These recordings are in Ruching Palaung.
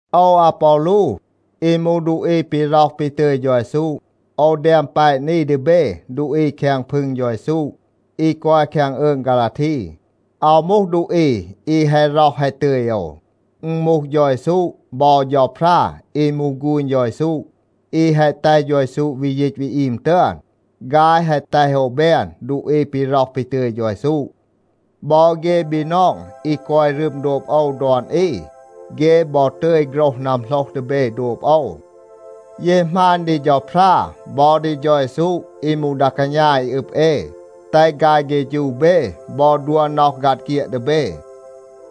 โอว อาปอลู อี มูห ดูอี ปี ร็อห ปี ตึย เฌา เยซู, โอว แดม แปะ นี ดี เบ ดูอี แคง พึง เฌา เยซู อี กอย แคง อืง ฆาลาที. อาว มูห ดูอี อี แฮะ ร็อห แฮะ ตึย โอว. อึณ มูห เฌา เยซู บอ เฌาพรา อี มูห ฆูณ เฌา เยซู, อี แฮะ แตห เฌา เยซู วี ยีต วี อีม ตึอน, ฆาย แฮะ แตห โอว แบน ดูอี ปี ร็อห ปี ตึย เฌา เยซู. บอ เฆ บีนอง อี กอย รึม โดบ โอว ดอน อี, เฆ บอ ตึย โฆรห นัมโหลห ดี เบ โดบ โอว. เย หมาณ ดี เฌาพรา บอ ดี เฌา เยซู อี มูห ดา กาณา อี อึบ เอ, แตห ฆาย เฆฌู เบ บอ ดัว น็อห ฆัด เฆียด ดี เบ.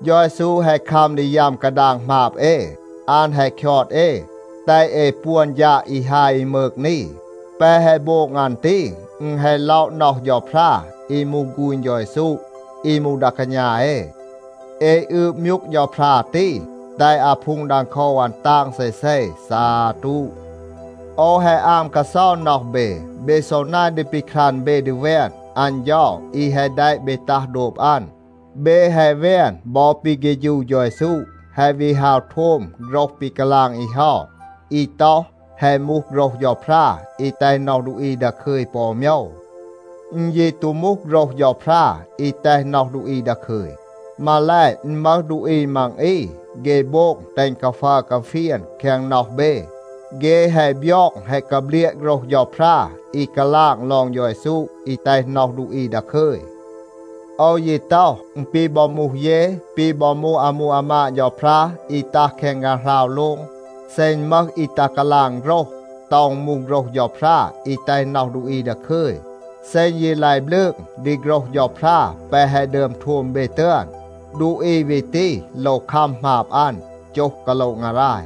เฌา เยซู แฮะ คัม ดี ยัม กาดาง หมาบ เอ. อัน แฮะ คยอด เอ, แตห เอ ปวน ฌาด อี ฮาย อี มืก นี. แปะ แฮะ โบง อัน ตี, อึณ แฮะ ล็อะ น็อห เฌาพรา อี มูห ฆูณ เฌา เยซู อี มูห ดา กาณา เอ. เอ อืบ มยูก เฌาพรา ตี, แตห อาพูง ดังโคว อัน ตาง เซเซ. ซาตู. โอว แฮะ อาม กาเซา น็อห เบ, เบ ซอ นาย ดี ปีครัน เบ ดี แวน อัน เฌา อี แฮะ แดะ เบ ตัห โดบ อัน. เบ แฮะ แวน บอ ปี เฆฌู เฌา เยซู, แฮะ วี ฮาว โทม โฆรห ปี กาลาง อี เฮา อี ต็อห, แฮะ มูห โฆรห เฌาพรา อี แตห น็อห ดูอี ดาคึย ปอ อู โมยว. อึณ ยี ตู มูห โฆรห เฌาพรา อี แตห น็อห ดูอี ดาคึย. มาแล, อึณ มึห ดูอี มัง อี, เฆ โบง แตห อึณ กาฟัร กาเฟียน แคง น็อห เบ. เฆ แฮะ บยอง แฮะ กาเบลียะ โฆรห เฌาพรา อี กาลาง ลอง เฌา เยซู อี แตห น็อห ดูอี ดาคึย. โอว ยี ต็อห, อึณ ปี บอ มูห เย, ปี บอ มูห อามู อามาด เฌาพรา อี ตัห แคง ฆางหราว โลง, เซ อึณ มึห อี ตัห กาลาง โฆรห, ต็อห อึณ มูห โฆรห เฌาพรา อี แตห น็อห ดูอี ดาคึย, เซ อึณ ยี ลาย บลืง ดี โฆรห เฌาพรา แปะ แฮะ ดึอม โทม เบ ตึอน, ดูอี วี ตี โลว คัม หมาบ อัน, โจห กาโละ งาราย.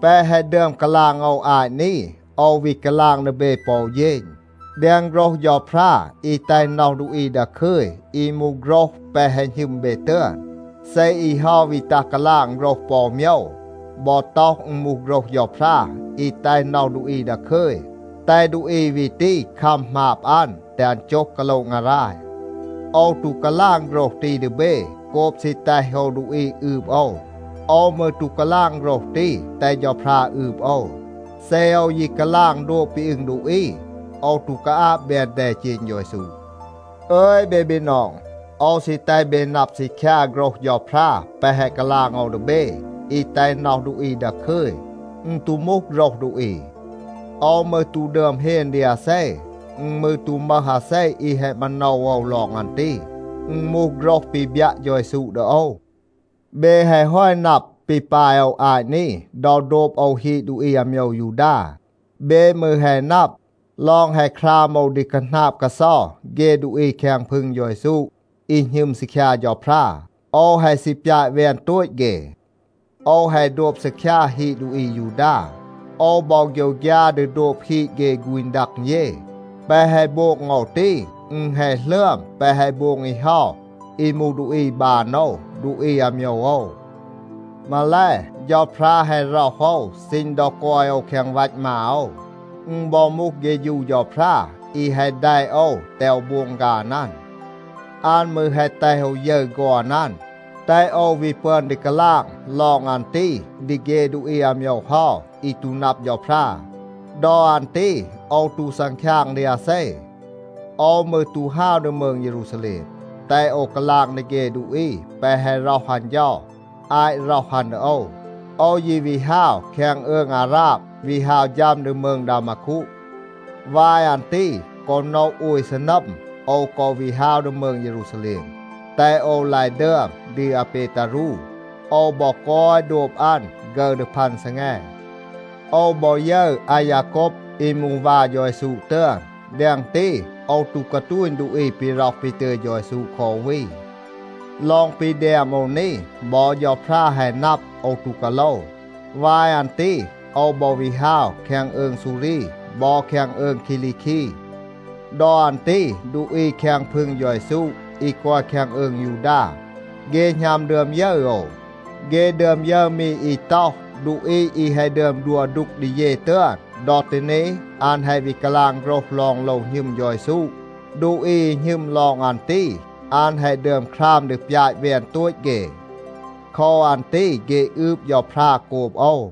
แปะ แฮะ ดึอม กาลาง โอว อาต นี, โอว วี กาลาง ดี เบ ปอ อู เฌณ. แดง โฆรห เฌาพรา อี แตห น็อห ดูอี ดาคึย, อี มูห โฆรห แปะ แฮะ หณึม เบ ตึอน, เซ อี เฮา วี ตัห กาลาง โฆรห ปอ อู โมยว, บอ ต็อห อึณ มูห โฆรห เฌาพรา อี แตห น็อห ดูอี ดาคึย, แตห ดูอี วี ตี คัม หมาบ อัน, แตห อัน โจห กาโละ งาราย. โอว ตู กาลาง โฆรห ตี ดี เบ โกบ ซี แตห โอว ดูอี อืบ โอว. โอว มืร ตู กาลาง โฆรห ตี, แตห เฌาพรา อืบ โอว. เซ โอว ยี กาลาง โดบ ปี อึง ดูอี, โอว ตู กาอาบ แบน แดเจณ เฌา เยซู. อึย เบ บีนอง, โอว ซี แตห เบ นับ ซีคยา โฆรห เฌาพรา แปะ แฮะ กาลาง โอว ดี เบ, อี แตห น็อห ดูอี ดาคึย, อึณ ตู มูห โฆรห ดูอี. โอว มืร ตู ดึอม เฮน ดี อาเซ. อึณ มืร ตู มึห อาเซ อี แฮะ มาโนว โอว ลอง อัน ตี. อึณ มูห โฆรห ปี บยัะ เฌา เยซู ดี โอว. เบ แฮะ ฮอต นับ ปี ปาย โอว อาต นี ดอ โดบ โอว ฮีด ดูอี อาโมยว ยูดา. เบ มืร แฮะ นับ ลอง แฮะ คราม โอว ดี คาหนาบ กาเซา เฆ ดูอี แคง พึง เฌา เยซู อี หณึม ซีคยา เฌาพรา. โอว แฮะ ซี ปยาต แวน โตต เฆ. โอว แฮะ โดบ ซีคยา ฮีด ดูอี อายูดา. โอว บอ โฆยวฆยา ดี โดบ ฮีด เฆ ฆูณ ดัง เย. แปะ แฮะ โบง โอว ตี, อึณ แฮะ หลึอม แปะ แฮะ โบง อี เฮา อี มูห ดูอี บาน โอว, ดูอี อาโมยว โอว. มาแล, เฌาพรา แฮะ ร็อห โอว ซีณ ดอ กอย โอว แคง วัต มา โอว. อึณ บอ มูห เฆฌู เฌาพรา อี แฮะ แดะ โอว แตห โอว โบง ฆาน อัน. อัน มืร แฮะ แตห โอว ยึร ฆอน อัน, แตห โอว วี ปึอน ดี กาลาง ลอง อัน ตี ดี เฆ ดูอี อาโมยว เฮา อี ตู นับ เฌาพรา. ดอ อัน ตี โอว ตู ซังคยาง ดี อาเซ. โอว มืร ตู ฮาว ดี มืง เยรูซาแลม, แตห โอว กาลาง ดี เฆ ดูอี แปะ แฮะ ร็อห อัน เฌา อาต ร็อห อัน ดี โอว. โอว ยี วี ฮาว แคง อืง อาราบ, วี ฮาว ฌัม ดี มืง ดามาคู. วาย อัน ตี กอ โนะ โอย ซีนัม, โอว กอ วี ฮาว ดี มืง เยรูซาแลม, แตห โอว ลาย ดึอม ดี อาเปตารู. โอว บอ กอย โดบ อัน ฆึร ดี พัน ซีแง. โอว บอ ยึร อายาโกบ อี มูห วา เฌา เยซู ตึอน. แดง ตี โอว ตู กาตูณ ดูอี ปี ร็อห ปี ตึย เฌา เยซู คอ อู วี. ลอง ปี แดม โอว นี, บอ เฌาพรา แฮะ นับ, โอว ตู กาโลว. วาย อัน ตี โอว บอ วี ฮาว แคง อืง ซูรี บอ แคง อืง คีลีคี. ดอ อัน ตี ดูอี แคง พึง เฌา เยซู อี กอย แคง อืง ยูดา, เฆ หณัม ดึอม ยึร โอว. เฆ ดึอม ยึร มี อี ต็อห, “ดูอี อี แฮะ ดึอม ดัว ดูก ดี เย ตึอน, ดอ ตี นี อัน แฮะ วี กาลาง โฆรห ลอง โลว หณึม เฌา เยซู. ดูอี อี หณึม ลอง อัน ตี, อัน แฮะ ดึอม คราม ดี ปยาต แวน โตต เฆ.” โคว อัน ตี เฆ อืบ เฌาพรา โกบ โอว.